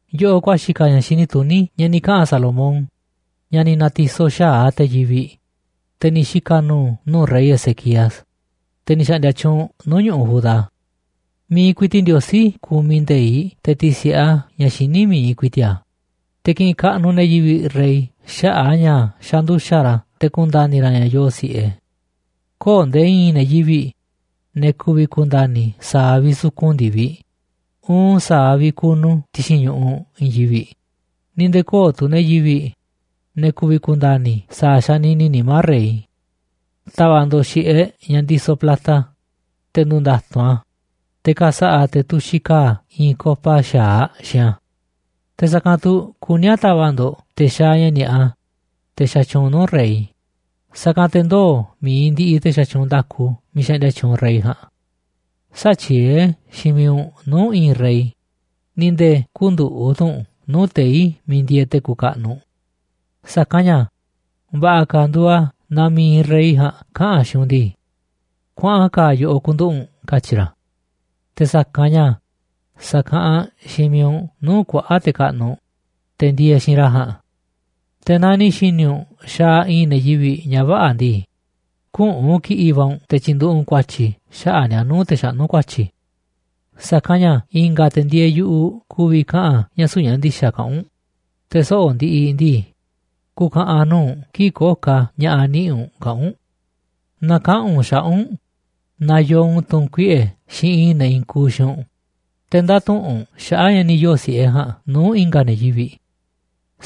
Yoꞌoꞌ ku̱a̱xi̱ ka̱ ña̱ xini tuní ña̱ ni̱ kaꞌa̱n Salomón ña̱ ni̱ na̱ti̱soꞌ xa̱aꞌ te̱ yivi̱ꞌ, te̱ ni̱ xika̱ nu̱u̱ nuu̱ꞌ rey Ezequías, te̱ ni̱ xa̱ꞌndi̱a̱ tyuunꞌ nuu̱ꞌ ñu̱ꞌuꞌ Judá. Mi̱iꞌ ku̱i̱ti̱ꞌ Ndiosí kumiꞌ nde̱iꞌ te̱ ti̱si̱ꞌe a̱ ña̱ xiní mi̱iꞌ ku̱i̱ti̱ꞌ a̱, te̱ kiꞌinꞌ kaꞌnuꞌ ne̱ yivi̱ꞌ rey xaꞌa̱ꞌ a̱ ña̱ xanduxa̱ꞌ ra̱ te̱ ku̱nda̱ni̱ ra̱ ña̱ yoo si̱ꞌe. Köo̱ꞌ nde̱e̱ i̱i̱n ne̱ yivi̱ꞌ, ne̱ ku̱vi̱ ku̱nda̱ni̱ sa̱a̱ vi̱ꞌ sukun ndi̱viꞌ uun sa̱a̱ vi̱ꞌ kunu ti̱xi̱n ñu̱ꞌuꞌ i̱i̱n yivi̱ꞌ, ni̱ nde̱e̱ köo̱ꞌ tu̱ ne̱ yivi̱ꞌ, ne̱ ku̱vi̱ ku̱nda̱ni̱ sa̱a̱ xanini nimá rey. Ta̱va̱ꞌ ndo̱ꞌ xi̱ꞌeꞌ ña̱ ndisoꞌ plata, te̱ ndu̱nda̱tu̱nꞌ a̱, te̱ ka̱sa̱ꞌa̱ te̱ tuxiꞌ ka̱a̱ i̱i̱n copa xa̱aꞌ xiinꞌ a̱. Te̱ sa̱kanꞌ tu̱ kuní a̱ ta̱va̱ꞌ ndo̱ꞌ te̱ xaaꞌ ña̱ ni̱a̱ꞌa, te̱ xatyuunꞌ nuu̱ꞌ rey, sa̱kanꞌ te̱ ndoo̱ mi̱iꞌ ndiꞌiꞌ te̱ xatyuunꞌ nda̱ku miiꞌ xaꞌndia tyuunꞌ rey ja̱a̱nꞌ. Sä̱tyieé xiinꞌ miiꞌ u̱nꞌ nuu̱ꞌ i̱i̱n rey, ni̱ nde̱e̱ kü̱nduꞌu̱ꞌ tu̱ u̱nꞌ nuu̱ꞌ tei̱ miiꞌ ndieeꞌ te̱ kuuꞌ kaꞌnuꞌ. Sa̱kanꞌ ña̱ va̱ꞌa̱ ka̱ nduuꞌ a̱ naaꞌ mi̱iꞌ rey ja̱a̱nꞌ kaꞌa̱n xiinꞌ u̱nꞌ ndii: “Kuaꞌan ka̱a̱ yoꞌoꞌ ku̱nduꞌu̱ꞌ u̱nꞌ”, katyi̱ ra̱, te̱ sa̱kanꞌ ña̱ sa̱kaꞌanꞌ xiinꞌ miiꞌ u̱nꞌ nuu̱ꞌ kuaꞌa̱ꞌ te̱ kaꞌnuꞌ, te̱ ndieeꞌ xiinꞌ ra̱ ja̱a̱nꞌ. Te̱ naaꞌ ni̱ xi̱ni̱ u̱nꞌ xaaꞌ i̱i̱n ne̱ yivi̱ꞌ ña̱ vä̱ꞌa̱ ndii, küꞌu̱n kiꞌi̱ꞌ va̱ u̱nꞌ te̱ tyi̱nduꞌu̱ꞌ u̱nꞌ ku̱a̱tyi̱ xaꞌa̱ꞌ ni̱a̱ nuu̱ꞌ te̱ xaꞌnú ku̱a̱tyi̱. Sa̱kanꞌ ña̱ i̱nga̱ te̱ ndieeꞌ yu̱ꞌuꞌ ku̱vi̱ kaꞌa̱n ña̱ süu̱ꞌ ña̱ ndi̱xa̱ kaꞌán u̱nꞌ, te̱ soꞌo̱ꞌ ndiꞌiꞌ ndii, ku̱u̱ ka̱ꞌa̱n nuu̱ꞌ u̱nꞌ kii̱ꞌ köo̱ꞌ ka̱ ña̱ꞌa̱ niꞌi̱ꞌ u̱nꞌ kaꞌa̱n u̱nꞌ. Na̱kaꞌa̱n u̱nꞌ xaꞌa̱ꞌ u̱nꞌ naaꞌ yoo u̱nꞌ tu̱ꞌu̱n kuiꞌe̱ xiinꞌ i̱i̱n ne̱ i̱i̱n kuuꞌ xiinꞌ u̱nꞌ, te̱ ndä̱tuꞌunꞌ u̱nꞌ xaꞌa̱ꞌ ña̱ ni̱ yoo̱ si̱ꞌe ja̱a̱nꞌ nuu̱ꞌ i̱nga̱ ne̱ yivi̱ꞌ.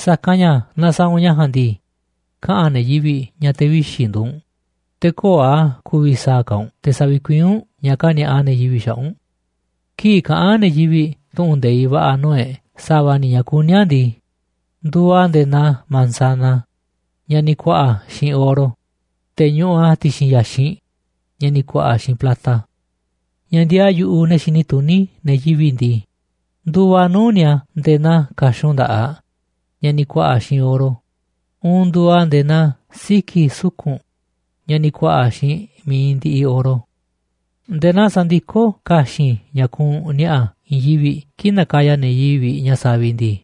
Sa̱kanꞌ ña̱ naaꞌ sa̱a̱ u̱nꞌ ña̱ ja̱a̱nꞌ ndii, kaꞌa̱n ne̱ yivi̱ꞌ ña̱ te̱ vixi̱ nduuꞌ u̱nꞌ, te̱ köo̱ꞌ a̱ ku̱vi̱ sa̱a̱ ka̱ u̱nꞌ te̱ sa̱vi̱kuiín u̱nꞌ ña̱ kani̱a̱ꞌa ne̱ yivi̱ꞌ xaꞌa̱ꞌ u̱nꞌ. Kii̱ꞌ kaꞌán ne̱ yivi̱ꞌ tu̱ꞌu̱n nde̱iꞌ va̱ꞌa̱ nuu̱ꞌ e̱ꞌ sa̱va̱ ni̱ ña̱ kuní a̱ ndii, nduuꞌ a̱ nde̱e̱ naa manzana ña̱ ni̱ ku̱a̱ꞌa̱ xiinꞌ oro, te̱ ñuꞌuꞌ a̱ ti̱xi̱n ya̱xinꞌ ña̱ ni̱ ku̱a̱ꞌa̱ xiinꞌ plata. Ña̱ ndiaa yu̱ꞌuꞌ ne̱ xini tuní ne̱ yivi̱ꞌ ndii, nduuꞌ a̱ nuu̱ꞌ ni̱a̱ nde̱e̱ naa ka̱xun nda̱ꞌaꞌ ña̱ ni̱ ku̱a̱ꞌa̱ xiinꞌ oro uun nduuꞌ a̱ nde̱e̱ naa siki̱ suku̱nꞌ ña̱ ni̱ ku̱a̱ꞌa̱ xiinꞌ mi̱iꞌ ndiꞌiꞌ oro. Nde̱e̱ naa sandikó ka̱xi̱n ña̱ kuunꞌ ni̱a̱ꞌa̱ i̱i̱n yivi̱ꞌ kii̱ꞌ nakaya ne̱ yivi̱ꞌ ña̱ saviꞌ ndii,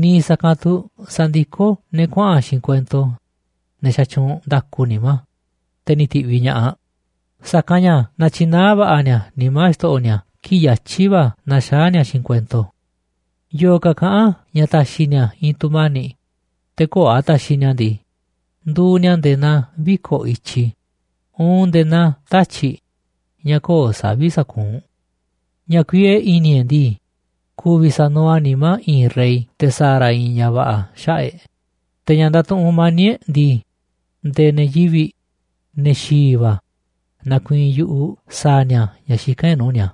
niiꞌ sa̱kanꞌ tu̱ sandikó ne̱ kuaꞌa̱n xiinꞌ kuento, ne̱ xatyuunꞌ nda̱ku nimá, te̱ ni̱ ti̱ꞌviꞌ ña̱ꞌaꞌ, sa̱kanꞌ ña̱ natyinaá va̱ꞌa̱ ni̱a̱ nimá xto̱ꞌo̱ ni̱a̱ kii̱ꞌ yatyi̱ va̱ naxaá ni̱a̱ xiinꞌ kuento. Yo̱o̱ ka̱ kaꞌán ña̱ ta̱xi̱ ni̱a̱ i̱i̱n tu̱mani̱ꞌ, te̱ köo̱ꞌ a̱ taxiꞌ ni̱a̱ ndii, nduuꞌ ni̱a̱ nde̱e̱ naa viko̱ꞌ i̱tyi uun nde̱e̱ naa tatyi̱ꞌ ña̱ köo̱ꞌ savi̱ꞌ sakuunꞌ. Ña̱ kuiee i̱ni̱ e̱ꞌ ndii, ku̱vi̱ sa̱nuuꞌ a̱ nimá i̱i̱n rey te̱ sa̱a̱ ra̱ i̱i̱n ña̱ va̱ꞌa̱ xaꞌa̱ꞌ e̱ꞌ, te̱ ña̱ ndatuꞌunꞌ mani̱ꞌ e̱ꞌ ndii, nde̱e̱ ne̱ yivi̱ꞌ, ne̱ xi̱i̱ va̱, na̱ku̱i̱i̱n yu̱ꞌuꞌ sa̱a̱ ni̱a̱ ña̱ xikán e̱ꞌ nuu̱ꞌ ni̱a̱.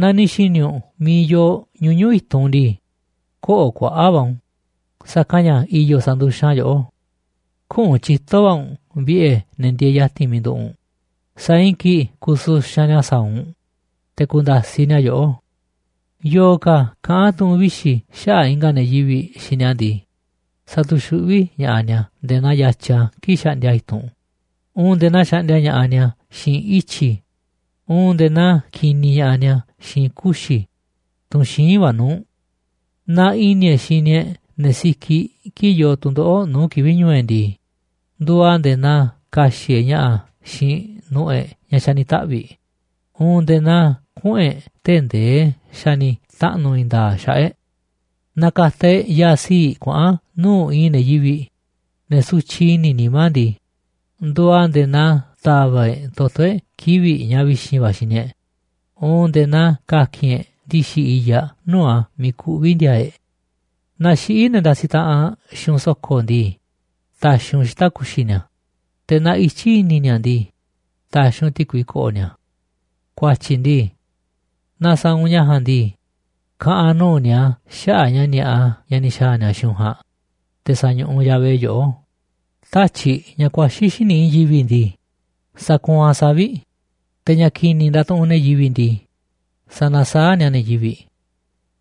Naaꞌ ni̱ xi̱ni̱ u̱nꞌ miiꞌ yoo ñuñu̱ꞌ i̱tunꞌ ndii, kö̱ꞌo̱ kuaꞌa̱ꞌ va̱ u̱nꞌ u̱n, sa̱kanꞌ ña̱ i̱yo̱ sa̱nduxanꞌ a̱ yoꞌó. Küꞌu̱n tyito̱ va̱ u̱nꞌ vi̱ꞌe̱ ne̱ ndieeꞌ ya̱ti̱n miiꞌ nduꞌu̱ꞌ u̱nꞌ, säa̱ꞌ i̱i̱n kii̱ꞌ ku̱suxanꞌ ni̱a̱ sa̱a̱ u̱nꞌ, te̱ ku̱nda̱siꞌ ni̱a̱ yoꞌó. Yo̱o̱ ka̱ kaꞌán tu̱ꞌu̱n vixi̱ xaꞌa̱ꞌ i̱nga̱ ne̱ yivi̱ꞌ xiinꞌ ni̱a̱ ndii, satuxuꞌví ña̱ꞌaꞌ ni̱a̱ nde̱e̱ naa yatya kii̱ꞌ xaꞌndia a̱ i̱tunꞌ uun nde̱e̱ naa xaꞌndia ña̱ꞌaꞌ ni̱a̱ xiinꞌ ityi̱ uun nde̱e̱ naa kiniꞌ ña̱ꞌaꞌ ni̱a̱ xiinꞌ kuxi̱, tunꞌ xíinꞌ va̱ nuu̱ꞌ. Naaꞌ i̱ni̱ e̱ꞌ xini e̱ꞌ ne̱ sikiꞌ kii̱ꞌ yoo tu̱ndoꞌo̱ꞌ nuu̱ꞌ kivi̱ꞌ ñu̱u̱ e̱ꞌ ndii, nduuꞌ a̱ nde̱e̱ naa ka̱xi̱ꞌ e̱ꞌ ña̱ꞌa̱ xiinꞌ nu̱ꞌu̱ e̱ꞌ ña̱ xa̱ ni̱ taꞌvi̱ꞌ uun nde̱e̱ naa kuꞌu̱n e̱ꞌ tee̱ꞌ ndee xa̱ ni̱ taꞌnu̱ i̱i̱n nda̱a̱ꞌ xaꞌa̱ꞌ e̱ꞌ. Naaꞌ ka̱ta̱ e̱ꞌ ya̱a̱ sii̱ꞌ kuaꞌa̱n nuu̱ꞌ i̱i̱n ne̱ yivi̱ꞌ, ne̱ sutyiꞌ i̱ni̱ nimá ndii, nduuꞌ a̱ nde̱e̱ naa ta̱va̱ꞌ e̱ꞌ toto̱ e̱ꞌ kivi̱ꞌ ña̱ vi̱xi̱n va̱ xini e̱ꞌ uun nde̱e̱ naa ka̱ki̱n e̱ꞌ ndi̱xi̱ i̱yaꞌ nuu̱ꞌ a̱ miiꞌ kuꞌví ndi̱a̱a̱ e̱ꞌ. Naaꞌ xiꞌí ne̱ ndasiꞌ taꞌanꞌ xiinꞌ u̱nꞌ so̱ko̱ ndii, ta̱xi̱ u̱nꞌ xita̱ꞌ ku̱xi̱ ni̱a̱, te̱ naaꞌ ityí i̱ni̱ ni̱a̱ ndii, ta̱xi̱ u̱nꞌ ti̱kui ko̱ꞌo̱ ni̱a̱. Ku̱a̱tyi̱ ndii, naaꞌ sa̱a̱ u̱nꞌ ña̱ ja̱a̱nꞌ ndii, ka̱ꞌa̱n nuu̱ꞌ ni̱a̱ xaꞌa̱ꞌ ña̱ ni̱a̱ꞌa ña̱ ni̱ xa̱a̱ ni̱a̱ xiinꞌ u̱nꞌ ja̱a̱nꞌ, te̱ sa̱ñuꞌuꞌ Yahvé yoꞌó. Tatyi̱ꞌ ña̱ ku̱a̱xi̱ xíniꞌ i̱i̱n yivi̱ꞌ ndii, sakuunꞌ a̱ savi̱ꞌ, te̱ ña̱ ki̱ni̱ ndatuꞌunꞌ ne̱ yivi̱ꞌ ndii, sanasaáꞌ ni̱a̱ ne̱ yivi̱ꞌ.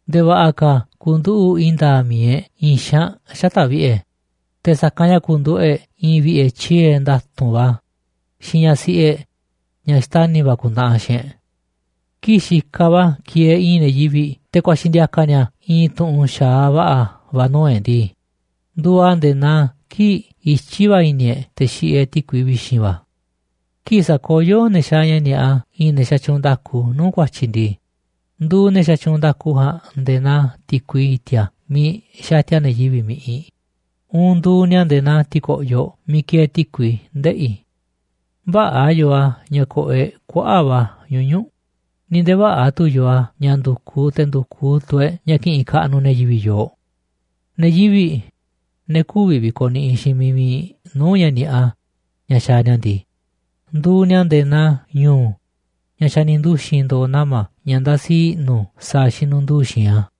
Nde̱e̱ va̱ꞌa̱ ka̱ ku̱nduꞌu̱ꞌ i̱i̱n nda̱a̱ꞌ mi̱iꞌ e̱ꞌ i̱i̱n xaanꞌ xata̱ꞌ vi̱ꞌe̱, te̱ sa̱kanꞌ ña̱ ku̱nduꞌu̱ꞌ e̱ꞌ i̱i̱n vi̱ꞌe̱ tyie̱ nda̱tu̱nꞌ va̱ xiinꞌ ñaꞌ siꞌi e̱ꞌ ñaꞌ xtani̱ va̱ ku̱ntaꞌanꞌ aꞌ xiinꞌ e̱ꞌ. Kii̱ꞌ xikaꞌ va̱ kieeꞌ i̱i̱n ne̱ yivi̱ꞌ te̱ ku̱a̱xi̱ ndi̱a̱ka̱ ni̱a̱ i̱i̱n tu̱ꞌu̱n xa̱aꞌ va̱ꞌa̱ va̱ nuu̱ꞌ e̱ꞌ ndii, nduuꞌ a̱ nde̱e̱ naa kii̱ꞌ ityí va̱ i̱ni̱ e̱ꞌ te̱ xiꞌiꞌ e̱ꞌ ti̱kui vi̱xi̱n va̱. Kii̱ꞌ sa̱koyó ne̱ xaaꞌ ña̱ ni̱a̱ꞌa i̱i̱n ne̱ xatyuunꞌ nda̱ku nuu̱ꞌ ku̱a̱tyi̱ ndii, nduuꞌ ne̱ xatyuunꞌ nda̱ku ja̱a̱nꞌ nde̱e̱ naa ti̱kui i̱ti̱a̱ miiꞌ xatia ne̱ yivi̱ꞌ mi̱ꞌiꞌ uun nduuꞌ ni̱a̱ nde̱e̱ naa ti̱ko̱ꞌyoꞌ miiꞌ kieeꞌ ti̱kui ndeꞌi̱. Vä̱ꞌa̱ yoo a̱ ña̱ ko̱ꞌo̱ e̱ꞌ kuaꞌa̱ꞌ va̱ ñuñu̱ꞌ, ni̱ nde̱e̱ vä̱ꞌa̱ tu̱ yoo a̱ ña̱ ndu̱kuꞌ te̱ ndu̱kuꞌ tu̱ e̱ꞌ ña̱ ki̱ꞌi̱n kaꞌnuꞌ ne̱ yivi̱ꞌ yooꞌ. Ne̱ yivi̱ꞌ, ne̱ kü̱vi̱ vi̱ko̱ niꞌiꞌ xiinꞌ miiꞌ mi̱iꞌ nuu̱ꞌ ña̱ ni̱a̱ꞌa ña̱ xaaꞌ ni̱a̱ ndii, nduuꞌ ni̱a̱ nde̱e̱ naa ñu̱u̱ ña̱ xa̱ ni̱ nduxi̱n ndo̱o̱ nama̱ ña̱ ndasi i̱ꞌnu̱ sa̱a̱ xinunduu xi̱i̱nꞌ a̱.